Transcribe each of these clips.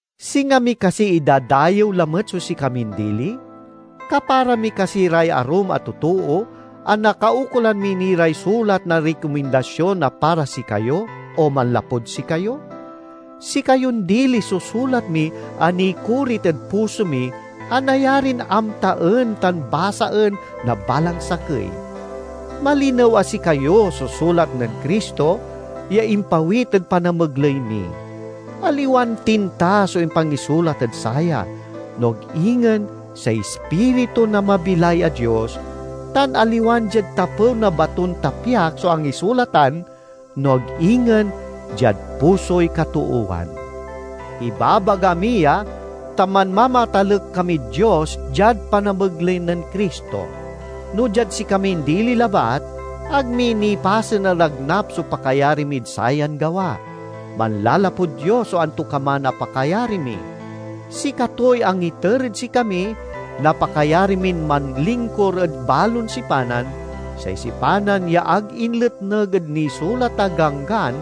Singa mi kasi idadayew lamet so sikamin dili? Kapara mi kasi ray arum a totoo a nakaukolan mi ni ray sulat na rikomindasion a para sikayo o manlapud sikayo? Sikayon dili so sulat mi a nikorit ed puso mi a nayarin amtaen tan basaen na balang sakey. Malinew a sikayo so sulat nen Cristo ya impawit ed panamegley mi. Aliwan tinta so impangisulat ed saya, no ag ingen say Ispiritu na mabilay a Dios; tan aliwan diad tapew na baton tapyak so angisulatan, no ag ingen diad pusoy katoowan. Ibabaga mi ya, ta manmamatalek kamid Dios diad panamegley nen Cristo. No diad sikamin dili labat, ag mi nipasen a nagnap so pakayari mid sayan gawa; manlalapud Dios so antokaman a pakayari mi. Sikatoy angiter ed sikami na pakayari min manlingkur ed balon sipanan, say sipanan ya ag inletneg ed nisulat a ganggan,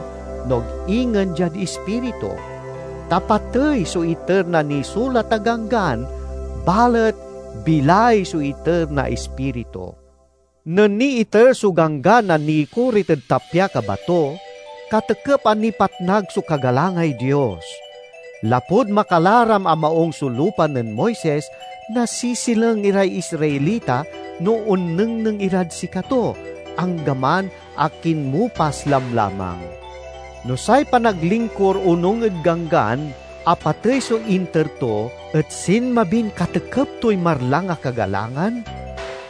no ag ingen diad Ispiritu. Ta patey so iter na nisulat a ganggan, balet bilay so iter na Ispiritu. Nen niiter so Ganggan a nikorit ed tapyak a bato, katekep a nipatnag so kagalangay Dios. Lapud makalaram a maung so lupa nen Moises, nasisileng iray Israelita no onnengneng irad sikato, anggaman a kinmupas lamlamang. No say panaglingkur onung ed Ganggan a patey so inter to et sinmabin katekep toy marlang a kagalangan,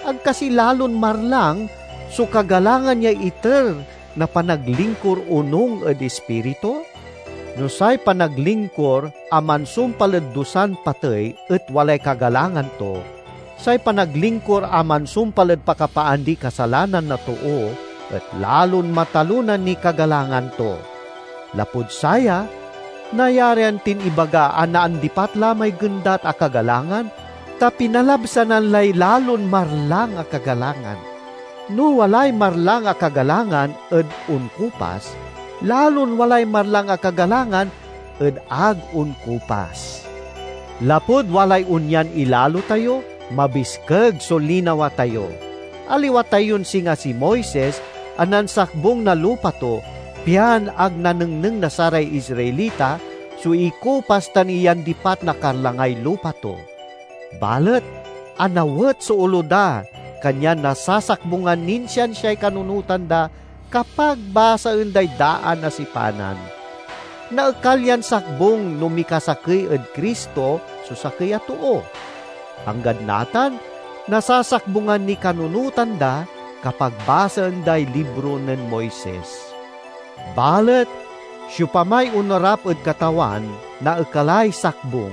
ag kasi lalon marlang so kagalangan ya iter na panaglingkur onung ed Ispiritu? No say panaglingkur a mansumpal ed dusan patey et walay kagalangan to, say panaglingkur a mansumpal ed pakapaandiy kasalanan na too et lalon matalona niy kagalangan to. Lapud saya nayarian tin ibaga a naandipat la may gendat a kagalangan, ta pinalabsanan lay lalon marlang a kagalangan. No walay marlang a kagalangan ed onkupas, lalon walay marlang a kagalangan ed ag onkupas. Lapud walay onyan ilalo tayo, mabiskeg so linawa tayo. Aliwa tayon singa si Moises a nansakbung na lupa to, pian ag nanengneng na saray Israelita so ikupas tan iyandipat na karlangay lupa to. Balet anawet so olo da kanyan nasasakbungan nin siansiay kanunotan da, kapag basaen day daan a sipanan. Naekal yan sakbung no mikasakey ed Cristo so sakey a too. Anggad natan, nasasakbungan niy kanunotan da kapag basaen day libro nen Moises. Balet siopamay onarap ed Katawan naekalay sakbung.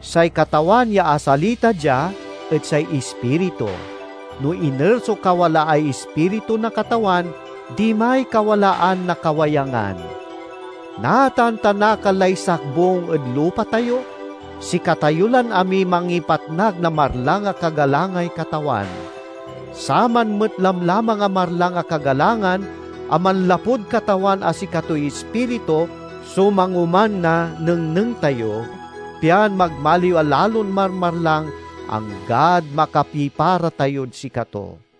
Say Katawan ya asalita dia et say Ispiritu; no iner so kawalaay Ispiritu na Katawan, dimay kawalaan na kawayangan. Natan ta nakal lay sakbung ed lupa tayo, sikatayo lan amiy mangipatnag na marlang a kagalangay Katawan. Saman met lamlamang a marlang a kagalangan a manlapud Katawan a sikatoy Ispiritu so mangoman na nengneng tayo pian magmaliw a lalon marmarlang, anggad makapipara tayod sikato.